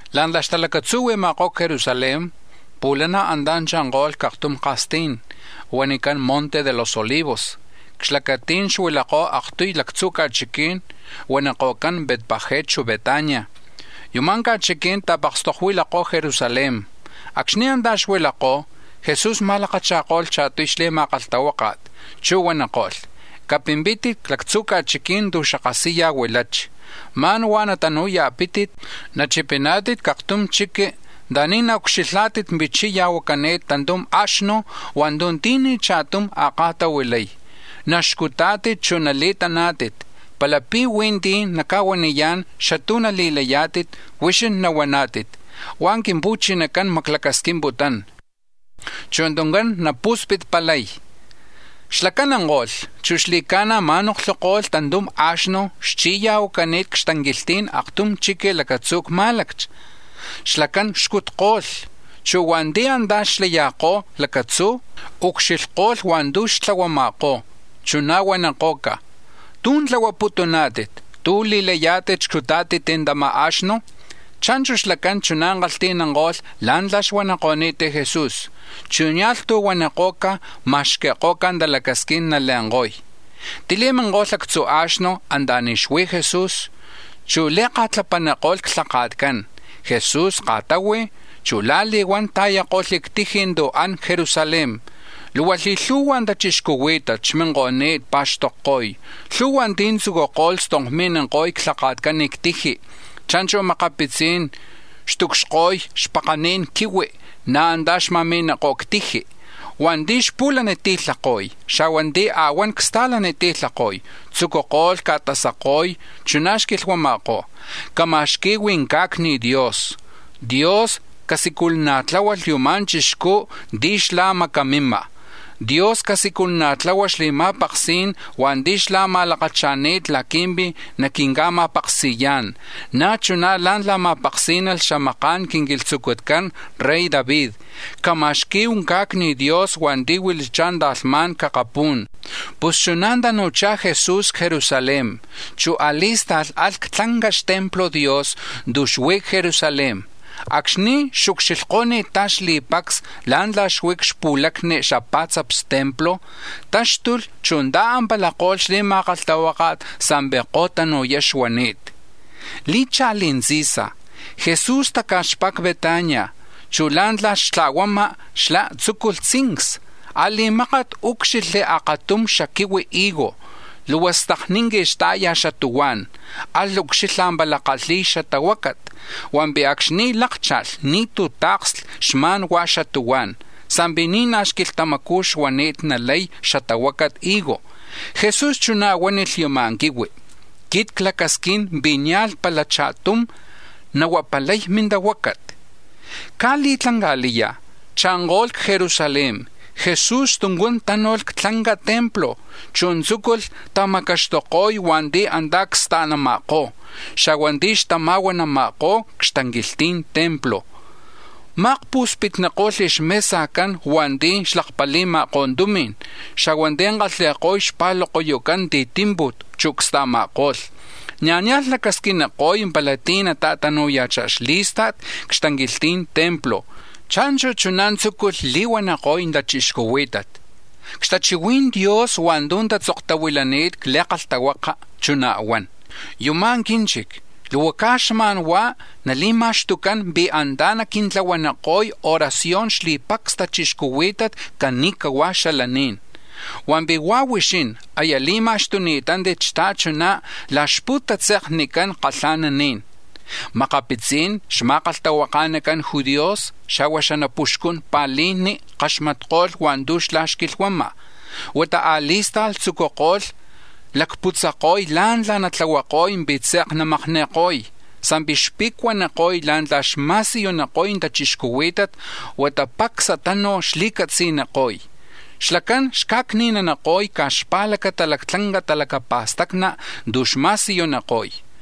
La̱ntla̱ xtalacatzuhui̱ma̱kó̱ c-Jerusalén, pu̱lana̱ antá̱ cha̱nko̱lh c-aktum ka̱stí̱n, huanicán Monte de los Olivos, c-xlacatí̱n xuilakó̱ aktuy lactzu̱ ca̱chiquí̱n huaniko̱cán Betfagé, chu̱ Betania; yuma̱ ca̱chiquí̱n ta̱pakstokuilakó̱ Jerusalén. Acxni̱ antá̱ xuilakó̱, Jesu̱s ma̱lakacha̱ko̱lh cha̱tuy xli̱ma̱kalhtahuáka̱t, chu̱ huaniko̱lh: —Capimpítit c-lactzu̱ ca̱chiquí̱n tu̱ xapu̱lana̱ huilachi, ma̱n huá̱ natanu̱ya̱pítit, nachipiná̱tit c-aktum chiqui̱ anta̱ni̱ naucxilhá̱tit pi̱ chi̱ya̱huacani̱t tantum a̱xnu̱ hua̱ntu̱ ti̱ni̱ cha̱tum a̱ka̱tahuilay; naxcutá̱tit, chu̱ nali̱taná̱tit. Palapi̱ huí̱ ti̱ naca̱huaniyá̱n xatú̱ nali̱layá̱tit, huixín nahuaná̱tit: ‘Hua̱ Quimpu̱chinacán maclacasquimputún, chu̱ tuncán napu̱spitpalay.’ Xlacán anko̱lh, chu̱ xli̱ca̱na̱ ma̱noklhuko̱lh tantum a̱xnu̱ xchi̱ya̱huacani̱t c-xtanquilhti̱n aktum chiqui̱ lacatzu̱ c-má̱laccha. Xlacán xcutko̱lh, chu̱ hua̱nti̱ antá̱ xyakó̱ lacatzú̱, ucxilhko̱lh hua̱ntu̱ xtlahuama̱kó̱, chuná̱ huaniko̱ca̱: —¿Tú̱ tlahuaputuná̱tit? ¿Tú̱ li̱layá̱tit xcutá̱tit tama̱ a̱xnu̱? Cha̱nchu̱ xlacán, chuná̱ kalhti̱nanko̱lh la̱ntla̱ xuaniko̱ni̱t Jesús, chu̱ nia̱lh tú̱ huaniko̱ca̱, ma̱xqui̱ko̱ca̱ talacasquín nale̱nko̱y. Tili̱miniko̱lh actzu̱ a̱xnu̱ anta̱ni̱ xuí̱ Jesús, chu̱ li̱ka̱tlapaniko̱lh xlhaka̱tcán. Jesús ka̱tahui̱, chu̱ la̱li̱huán ta̱yako̱lh c-tiji̱ tu̱ an c-Jerusalén. Luhua li̱lhu̱hua̱ tachixcuhuí̱tat xminko̱ni̱t pa̱xtokko̱y. Lhu̱hua̱ ti̱ tzucuko̱lh stonkmi̱ko̱y xlhaka̱tcán c-tiji, cha̱nchu̱ makapitzí̱n xtucxko̱y xpakani̱n quihui̱, na̱ antá̱ xma̱mi̱ma̱kó̱ c-tiji. Hua̱nti̱ xpu̱laniti̱lhako̱y, xa̱hua̱ ti̱ a̱huán csta̱lati̱lhako̱y, tzucuko̱lh ca̱tasako̱y, chuná̱ xquilhuama̱kó̱: —¡Cama̱xqui̱hu ca̱cni̱ Dios! ¡Dios casiculana̱tláhualh yuma̱ chixcú̱ ti̱ xlá̱ macamima̱! ¡Dios casiculana̱tláhualh xli̱ma̱paksí̱n hua̱nti̱ xlá̱ ma̱lakacha̱ni̱t laqui̱mpi̱ naquinca̱ma̱paksi̱yá̱n, na̱ chuná̱ la̱ntla̱ ma̱paksí̱nalh xamaka̱n quinquilhtzucutcán rey David! ¡Cama̱xqui̱hu ca̱cni̱ Dios hua̱nti̱ huilachá̱ ta̱lhmá̱n c-akapú̱n! Pus chuná̱ tanu̱chá̱ Jesús c-Jerusalén, chu̱ a̱li̱sta̱lh alh c-tlanca xtemplo̱ Dios tu̱ xuí̱ c-Jerusalén. Acxni̱ xucxilhko̱ni̱ttá̱ xli̱pacs la̱ntla̱ xui̱ c-xpu̱lacni xapa̱tzaps templo, táxtulh, chu̱ ta̱ampalako̱lh xli̱ma̱kalhtahuáka̱t sa̱mpi̱ ko̱tanu̱yá xuani̱t. Li̱cha̱li̱ tzi̱sa̱, Jesús taca̱xpá̱ c-Betania, chu̱ la̱ntla̱ xtla̱huama̱ xlá̱ tzúculh tzincsa. A̱li̱mákat úcxilhli̱ akatum xaquihui higo, luhua stakninqui xta̱ya̱ xatuhuá̱n; alh ucxilha̱ pala kalhi̱y xatahuácat. Hua̱mpi̱ acxni̱ lákcha̱lh, ni̱tú̱ ta̱ksli, xma̱n hua̱ xatuhuá̱n; sa̱mpi̱ ni̱ naj xquilhtamacú̱ xuani̱t nalay xatahuacat higo. Jesús chuná̱ huánilh yama̱ quihui: —Quit clacasquín pi̱ nia̱lh pala cha̱tum nahuapalay mintahuácat. Caj li̱tlanca̱liya̱ cha̱nko̱lh c-Jerusalén; Jesús tuncán tánu̱lh c-tlanca templo, chu̱ tzúculh tamacaxtuko̱y hua̱nti̱ antá̱ csta̱nama̱kó̱, xa̱hua̱ ti̱ xtama̱huanama̱kó̱ c-xtanquilhti̱n templo. Ma̱akpu̱spitniko̱lh xmesajcán hua̱nti̱ xlakpali̱ma̱kó̱ tumi̱n, xa̱hua̱ ti̱ csillajcan csta̱lani̱n palomas, chu̱ csta̱ma̱ko̱lh. Na̱ nia̱lh xlacasquiniko̱y pala ti̱ nata̱tanu̱ya̱chá̱ xlí̱sta̱t c-xtanquilhti̱n templo. Cha̱nchu̱ chuná̱ tzucuko̱lh li̱huaniko̱y tachixcuhuí̱tat: —C-xtachihui̱n Dios hua̱ntu̱ tatzoktahuilani̱t c-Li̱kalhtahuaka, chuná̱ huan: ‘Yuma̱ quínchic, luhua caj xma̱n huá̱ nali̱ma̱xtucán pi̱ antá̱ naquintlahuaniko̱y oración xli̱pacs tachixcuhuí̱tat cani̱cahua̱ xalaní̱n’, hua̱mpi̱ hua̱ huixín aya li̱ma̱xtuni̱tántit xta̱chuná̱ la̱ xpu̱tatze̱knican kalha̱naní̱n. Makapitzi̱n xma̱kalhtahuaka̱nacan judíos, xa̱hua̱ xanapuxcun pa̱lijni̱ kaxmatko̱lh hua̱ntu̱ xlá̱ xquilhuama̱, huata a̱li̱sta̱lh tzucuko̱lh lacputzako̱y la̱ntla̱ natlahuako̱y pi̱ tze̱k namakni̱ko̱y, sa̱mpi̱ xpe̱cuaniko̱y la̱ntla̱ xma̱siyuniko̱y tachixcuhuí̱tat huata pacsa tanu̱ xli̱catzi̱niko̱y, xlacán xca̱cni̱naniko̱y caj xpa̱lacata lactlanca talacapa̱stacni̱ tu̱ xma̱siyuniko̱y.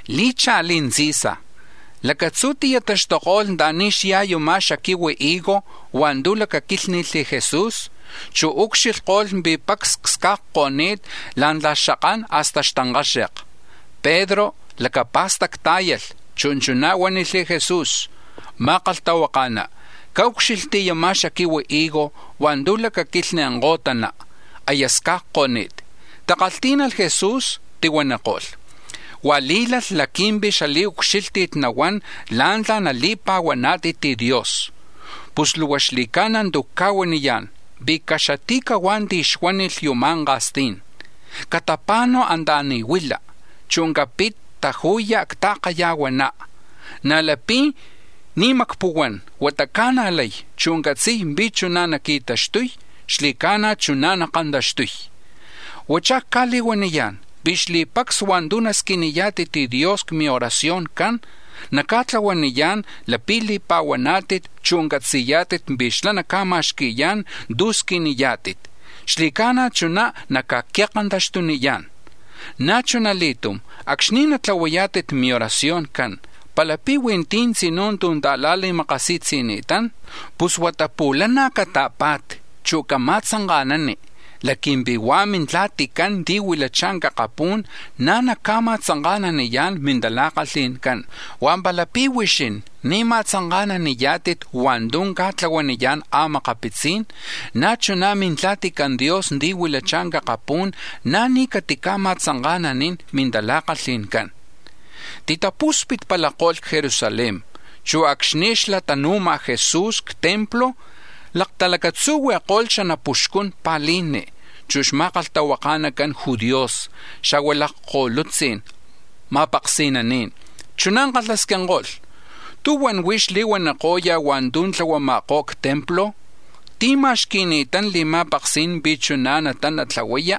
Li̱cha̱li̱ tzi̱sa̱, lacatzú̱ ti̱taxtuko̱lh anta̱ni̱ xyá̱ yama̱ xaquihui higo hua̱ntu̱ lacaquílhni̱lh Jesús, chu̱ ucxilhko̱lh pi̱ pacs csca̱cko̱ni̱t la̱ntla̱ xakán hasta xtankaxe̱k. Pedro lacapa̱stactá̱yalh, chu̱ chuná̱ huánilh Jesús: —Ma̱kalhtahuaka̱ná, caúcxilhti̱ yama̱ xaquihui higo hua̱ntu̱ lacaquilhni̱ kó̱tana, aya sca̱cko̱ni̱t. Tikalhtí̱nalh Jesús, tihuaniko̱lh: —Huá̱ lí̱lalh laqui̱mpi̱ xali̱ucxílhti̱t nahuán la̱ntla̱ mili̱pa̱huanat Dios. Pus luhua xli̱ca̱na̱ tu̱ cca̱huaniyá̱n, pi̱ caxati̱cahuá̱ ti̱ xuánilh yuma̱ ka̱stí̱n: ‘Catapa̱nu̱ anta̱ni̱ huila, chu̱ capit taju̱ya̱ c-ta̱kaya̱huaná’, na̱ lapi̱ ni̱ macpuhuán, huata ca̱najlay, chu̱ catzi̱y pi̱ chuná̱ naqui̱taxtuy, xli̱ca̱na̱ chuná̱ nakantaxtuy. Huachá̱ cca̱li̱huaniyá̱n pi̱ xli̱pacs hua̱ntu̱ nasquiniyá̱tit Dios c-mioracioncán naca̱tlahuaniyá̱n, lapi̱ li̱pa̱huaná̱tit, chu̱ catzi̱yá̱tit pi̱ xlá̱ naca̱ma̱xqui̱yá̱n tu̱ squiniyá̱tit, xli̱ca̱na̱ chuná̱ naca̱qui̱kantaxtuniyá̱n. Na̱ chuna li̱tum acxni̱ natlahuayá̱tit mioracioncán, palapi̱ huí̱ ti̱ tzinú̱ tu̱ ta̱la̱li̱makasi̱tzi̱ni̱tán, pus huata pu̱lana̱ cata̱pa̱ti, chu̱ cama̱tzanka̱nani, laqui̱mpi̱ hua̱ Mintla̱ticán ti̱ huilachá̱ c-akapú̱n, na̱ naca̱ma̱tzanka̱naniyá̱n mintala̱kalhi̱ncán. Hua̱ palapi̱ huixín ni̱ nama̱tzanka̱naniyá̱tit hua̱ntu̱ ca̱tlahuaniyá̱n a̱makapitzí̱n, na̱ chuná̱ Mintla̱tican Dios ti̱ huilachá̱ c-akapú̱n, na̱ ni̱ catica̱ma̱tzanka̱nanín mintala̱kalhi̱ncán. Titapu̱spitpalako̱lh c-Jerusalén, chu̱ acxni̱ xlatanu̱ma̱ Jesús c-templo, laktalacatzuhui̱ko̱lh xanapuxcun pa̱lijni, chu̱ xma̱kalhtahuaka̱nacan judíos, xa̱hua̱ lakko̱lutzi̱n ma̱paksi̱naní̱n. Chuná̱ kalhasquinko̱lh: —¿Tú̱huan huix li̱huaniko̱ya̱ hua̱ntu̱ tlahuama̱kó̱ c-templo? ¿Tí̱ ma̱xqui̱ni̱tán li̱ma̱paksí̱n pi̱ chuná̱ natana tlahuaya?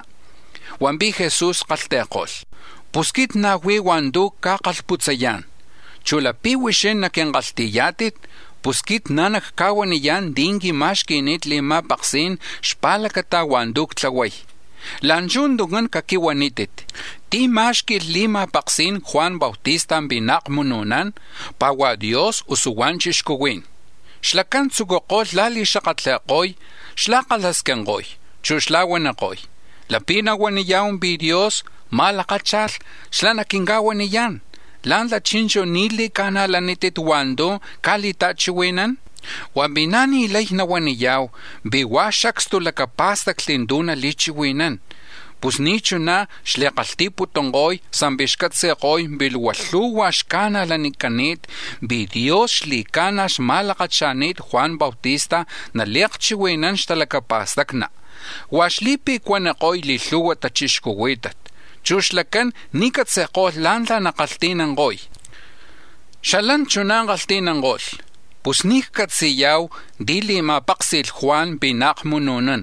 Hua̱mpi̱ Jesús kalhti̱ko̱lh: —Pus quit na̱ huí̱ hua̱ntu̱ nacca̱kalhputzayá̱n, chu̱ lapi̱ huixín naquinkalhti̱yá̱tit, pus quit na̱ nacca̱huaniyá̱n tí̱ quima̱xqui̱ni̱t li̱ma̱paksí̱n xpa̱lacata hua̱ntu̱ ctlahuay. La̱nchuj tuncán caquihuanítit: ¿tí̱ má̱xqui̱lh li̱ma̱paksí̱n Juan Bautista pi̱ naakmunu̱nán, pá̱ huá̱ Dios, usu hua̱ chixcuhuí̱n? Xlacán tzucuko̱lh la̱li̱xakatli̱ko̱y, xla̱kalhasquinko̱y, chu̱ xla̱huaniko̱y: “Lapi̱ nahuaniya̱hu pi̱ Dios ma̱lakácha̱lh, xlá̱ naquinca̱huaniyá̱n: ‘¿Lá̱ntla̱ chi̱nchu̱ ni̱ li̱ca̱najlanítit hua̱ntu̱ ca̱li̱ta̱chihui̱nán?’ Hua̱mpi̱ na̱ ni̱ lay nahuaniya̱hu pi̱ huá̱ xacstu lacapá̱stacli̱ tu̱ nali̱chihui̱nán.” Pus ni̱ chuná̱ xli̱kalhti̱namputunko̱y sa̱mpi̱ xcatzi̱ko̱y pi̱ luhua lhu̱hua̱ xca̱najlanicani̱t pi̱ Dios xli̱ca̱na̱ xma̱lakacha̱ni̱t Juan Bautista nali̱akchihui̱nán xtalacapa̱stacni, huá̱ xli̱pe̱cuaniko̱y xli̱lhu̱hua̱ tachixcuhuí̱tat, chu̱ xlacán ni̱ catzi̱ko̱lh la̱ntla̱ nakalhti̱nanko̱y. Xalán chuná̱ kalhti̱nanko̱lh: —Pus ni̱ ccatzi̱ya̱hu tí̱ li̱ma̱páksi̱lh Juan pi̱ naakmunu̱nán.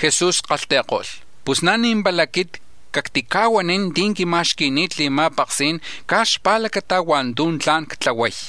Jesús kalhti̱ko̱lh: —Pus na̱ ni̱ pala quit cactica̱huanín tí̱ quima̱xqui̱ni̱t li̱ma̱paksí̱n caj xpa̱lacata hua̱ntu̱ tla̱n ctlahuay.